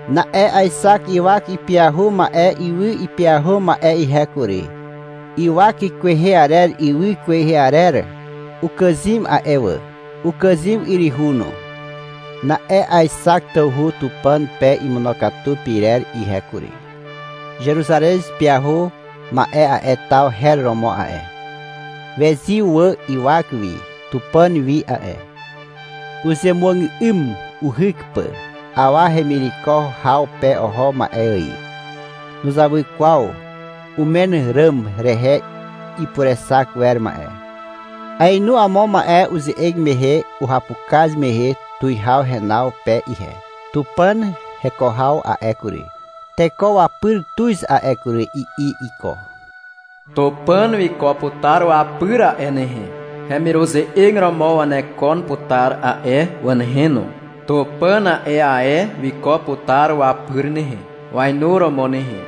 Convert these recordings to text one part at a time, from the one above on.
Na'e aexak ywak ipyahu ma'e ywy ipyahu ma'e ihe kury. Ywak kwehe arer ywy kwehe arer ukàzym a'e wà, ukàzym yryhu no. Na'e aexak tawhu Tupàn pe imonokatu pyrer ihe kury. Zeruzarez pyahu ma'e a'e taw her romo a'e. Wezyw wà ywak wi Tupàn wi a'e. Uzemuàgà'ym uhyk pà, awa hemireko haw pe oho ma'e ài. Nuzawy kwaw umen ràm rehe ipurexak wer ma'e. Aenu amo ma'e uze'eg mehe uhapukaz mehe tuwihaw henaw pe ihe. — Tupàn heko haw a'e kury, teko wapyr tuz a'e kury, i'i iko. — Tupàn wiko putar wapyr a'e nehe. Hemiruze'eg romo wanekon putar a'e wà nehe no. Tupàn a'e ae wiko putar wapyr nehe, wainuromo nehe.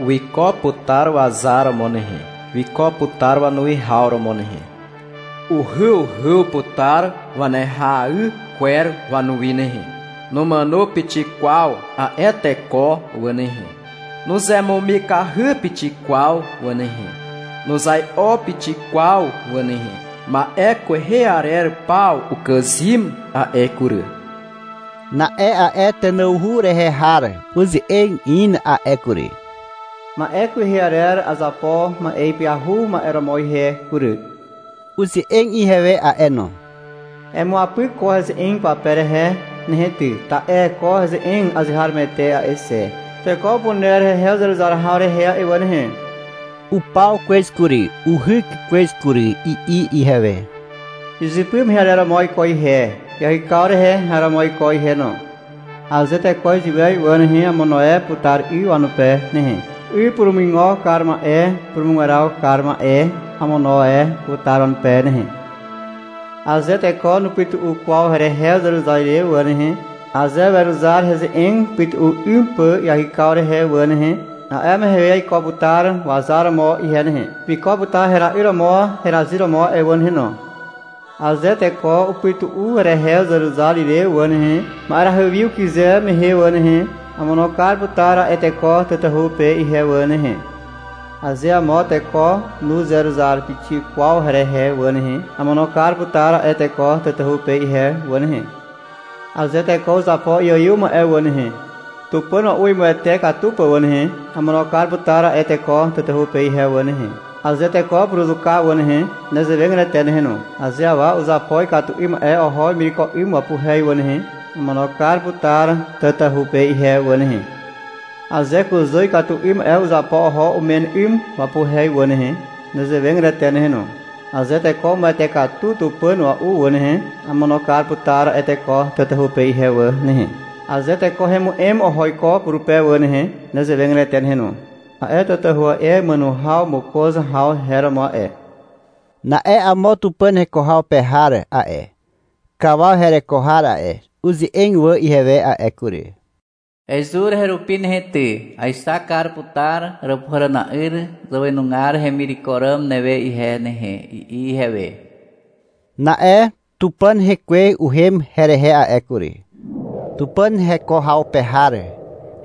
Wiko putar wazar romo nehe. Wiko putar wanuwihaw romo nehe. Uhyuhyw putar wanehay kwer wanuwi nehe. Numàno pixik kwaw a'e teko wà nehe. Nuzemumikahy pixik kwaw wà nehe. Nuzai'o pixik kwaw wà nehe. Ma'e kwehe arer paw ukàzym a'e kury. Na'e a'e tenawhu rehe har uze'eg in a'e kury. — Ma'e kwehe arer azapo ma'e ipyahu ma'e romo ihe kury, i'i wanupe. Uze'eg ihewe a'e no. — Emuapyk ko heze'eg pape rehe nehe ty, ta'e ko heze'eg azeharomoete a'e xe, teko upuner hehe uzeruzar haw rehe a'e wà nehe, i'i ihewe. — Upaw kwez kury, uhyk kwez kury, i'i ihewe. — Izypy mehe arer romo aiko ihe. Iahykaw rehe har romo aiko ihe no, i'i ihewe. — Aze teko iziwez wà nehe, amono e putar 'y wanupe nehe, 'y purumuigo kar ma'e purumugweraw kar ma'e amono e putar wanupe nehe. — Aze teko nupytu'u kwaw herehe uzeruzar ire wà nehe, aze weruzar heze'eg upytu'u 'ym pà iahykaw rehe wà nehe, a'e mehe aiko putar wazar romo ihe nehe. Wiko putar hera'yr romo herazyr romo a'e wà nehe no, i'i ihewe. — Aze teko upytu'u herehe uzeruzar ire wà nehe, ma'erahy wi ukyze mehe wà nehe, amono kar putar a'e teko tatahu pe ihe wà nehe, i'i ihewe. Aze amo teko nuzeruzar pixik kwaw herehe wà nehe, amono kar putar a'e teko tatahu pe ihe wà nehe. Aze teko uzapo iaiw ma'e wà nehe, tupàn ua'u imuwete katu pà wà nehe, amono kar putar a'e teko tatahu pe ihe wà nehe. Aze teko upuruzuka wà nehe, nezewegatete nehe no. Aze awa uzapo ikatu 'ym ma'e oho wemireko 'ym wapuhe wà nehe, amono kar putar tatahu pe ihe wà nehe. Aze kuzà ikatu 'ym ma'e uzapo oho umen 'ym wapuhe wà nehe, nezewegatete nehe no. Aze teko umuwete katu tupàn ua'u wà nehe, amono kar putar a'e teko tatahu pe ihe wà nehe. Aze teko hemu'em oho iko purupe wà nehe, nezewegatete nehe no. A'e tatahu a'e, màno haw mokoz haw her romo a'e. Na'e amo Tupàn heko haw pe har a'e, kawaw hereko har a'e, uze'eg wà ihewe a'e kury. — Ezur herupi nehe ty, aexak kar putar Àràpuhàràna'yr zàwenugar hemireko ràm newe ihe nehe, i'i ihewe. Na'e Tupàn Hekwe uhem herehe a'e kury. Tupàn heko haw pe har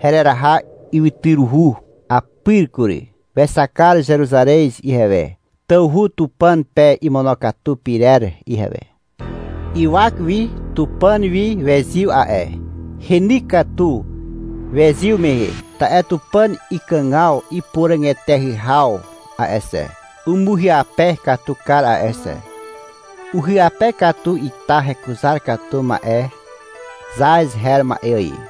hereraha ywytyruhu apyr kury. Wexak kar Zeruzarez ihewe, tawhu Tupàn pe imonokatu pyrer ihewe. Ywak wi Tupàn wi wezyw a'e. Heny katu wezyw mehe. Ta'e Tupàn ikàgaw ipuràg eteahy haw a'e xe, umuhyape katu kar a'e xe. Uhyape katu ita hekuzar katu ma'e zaz her ma'e ài.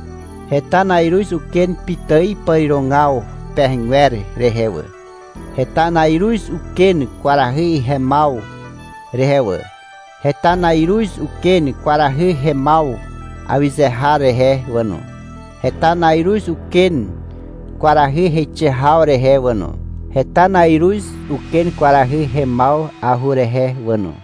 Heta na'iruz uken pitài pàrirogaw pehegwer rehe wà. Heta na'iruz uken kwarahy hemaw rehe wà. Heta na'iruz uken kwarahy hemaw awyze har rehe wà no. Heta na'iruz uken kwarahy heixe haw rehe wà no. Heta na'iruz uken kwarahy hemaw ahurehe wà no.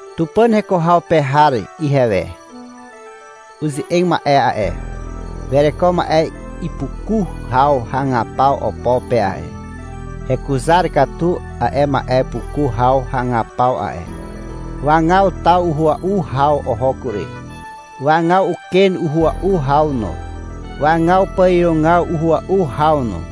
Tupàn heko haw pe har ihewe uze'eg ma'e a'e, wereko ma'e ipuku haw hagapaw opo pe a'e. Hekuzar katu a'e ma'e puku haw hagapaw a'e. Wagaw taw uhua'u haw oho kury. Wagaw uken uhua'u haw no. Wagaw pàrirogaw uhua'u haw no.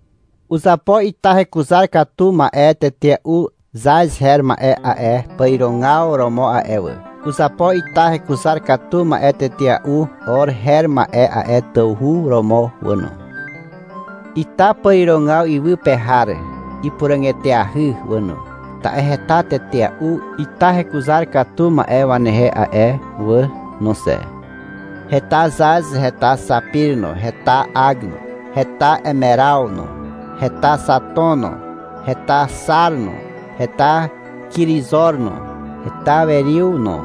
Uzapo ita hekuzar katu ma'e tetea'u zaz her ma'e a'e pàrirogaw romo a'e wà. Uzapo ita hekuzar katu ma'e tetea'u or her ma'e a'e tawhu romo wà no. Ita pàrirogaw iwy pe har ipuràg eteahy wà no, ta'e heta tetea'u ita hekuzar katu ma'e wanehe a'e wà no xe. Heta zaz, heta xapir no, heta ag no, heta emeraw no, heta xaton no, heta xar no, heta kirizor no, heta weriw no,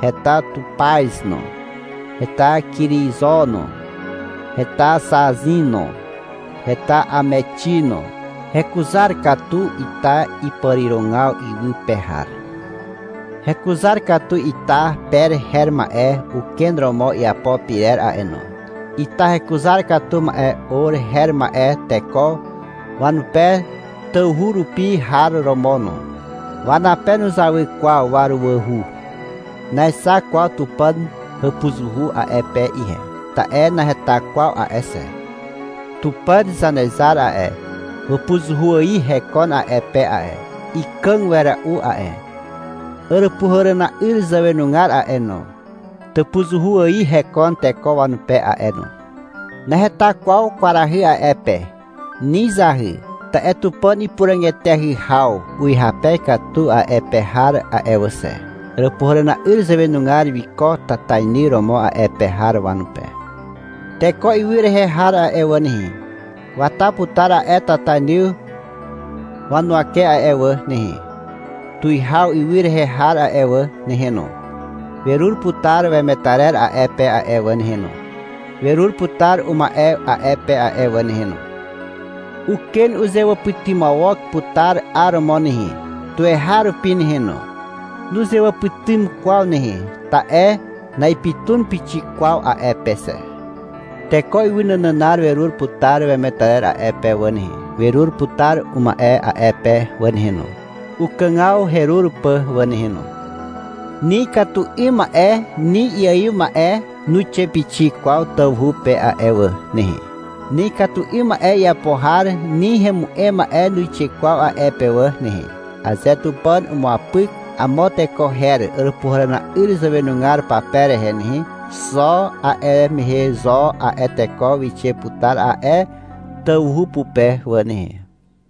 heta tupaz no, heta kirizo no, heta zaxin no, heta amexi no. Hekuzar katu ita ipàrirogaw iwy pe har. Hekuzar katu ita per her ma'e uken romo iapo pyrer a'e no. Ita hekuzar katu ma'e or her ma'e teko wanape tawhu rupi har romo no. Wanape nuzawy kwaw waruwahu. Naexak kwaw Tupàn hàpuzuhu a'e pe ihe, ta'e naheta kwaw a'e xe. Tupàn Zanezar a'e, wàpuzuhu ài hekon a'e pe a'e. Ikàg wera'u a'e. Àràpuhàràna'yr zàwenugar a'e no, tàpuzuhu ài hekon teko wanupe a'e no. Naheta kwaw kwarahy a'e pe, ni zahy. Ta'e Tupàn ipuràg eteahy haw uhyape katu a'e pe har a'e wà xe. Àràpuhàràna'yr zàwenugar wiko tatainy romo a'e pe har wanupe. Teko ywy rehe har a'e wà nehe, wata putar a'e tatainy huwake a'e wà nehe. Tuwihaw ywy rehe har a'e wà nehe no, werur putar wemetarer a'e pe a'e wà nehe no, werur putar uma'e a'e pe a'e wà nehe no. Uken uzewàpytymawok putar 'aromo nehe, tuweharupi nehe no. Nuzewàpytym kwaw nehe, ta'e na'ipytun pixik kwaw a'e pe xe. Teko ywy nànànar werur putar wemetarer a'e pe wà nehe. Werur putar uma'e a'e pe wà nehe no, ukàgaw herur pà wà nehe no. Ni ikatu 'ym ma'e ni iaiw ma'e nuixe pixik kwaw tawhu pe a'e wà nehe. Ni ikatu 'ym ma'e iapo har ni hemu'em ma'e nuixe kwaw a'e pe wà nehe. Aze Tupàn umuapyk amo teko her Àràpuhàràna'yr zàwenugar pape rehe nehe, xo a'e mehe zo a'e teko wixe putar a'e tawhu pupe wà nehe.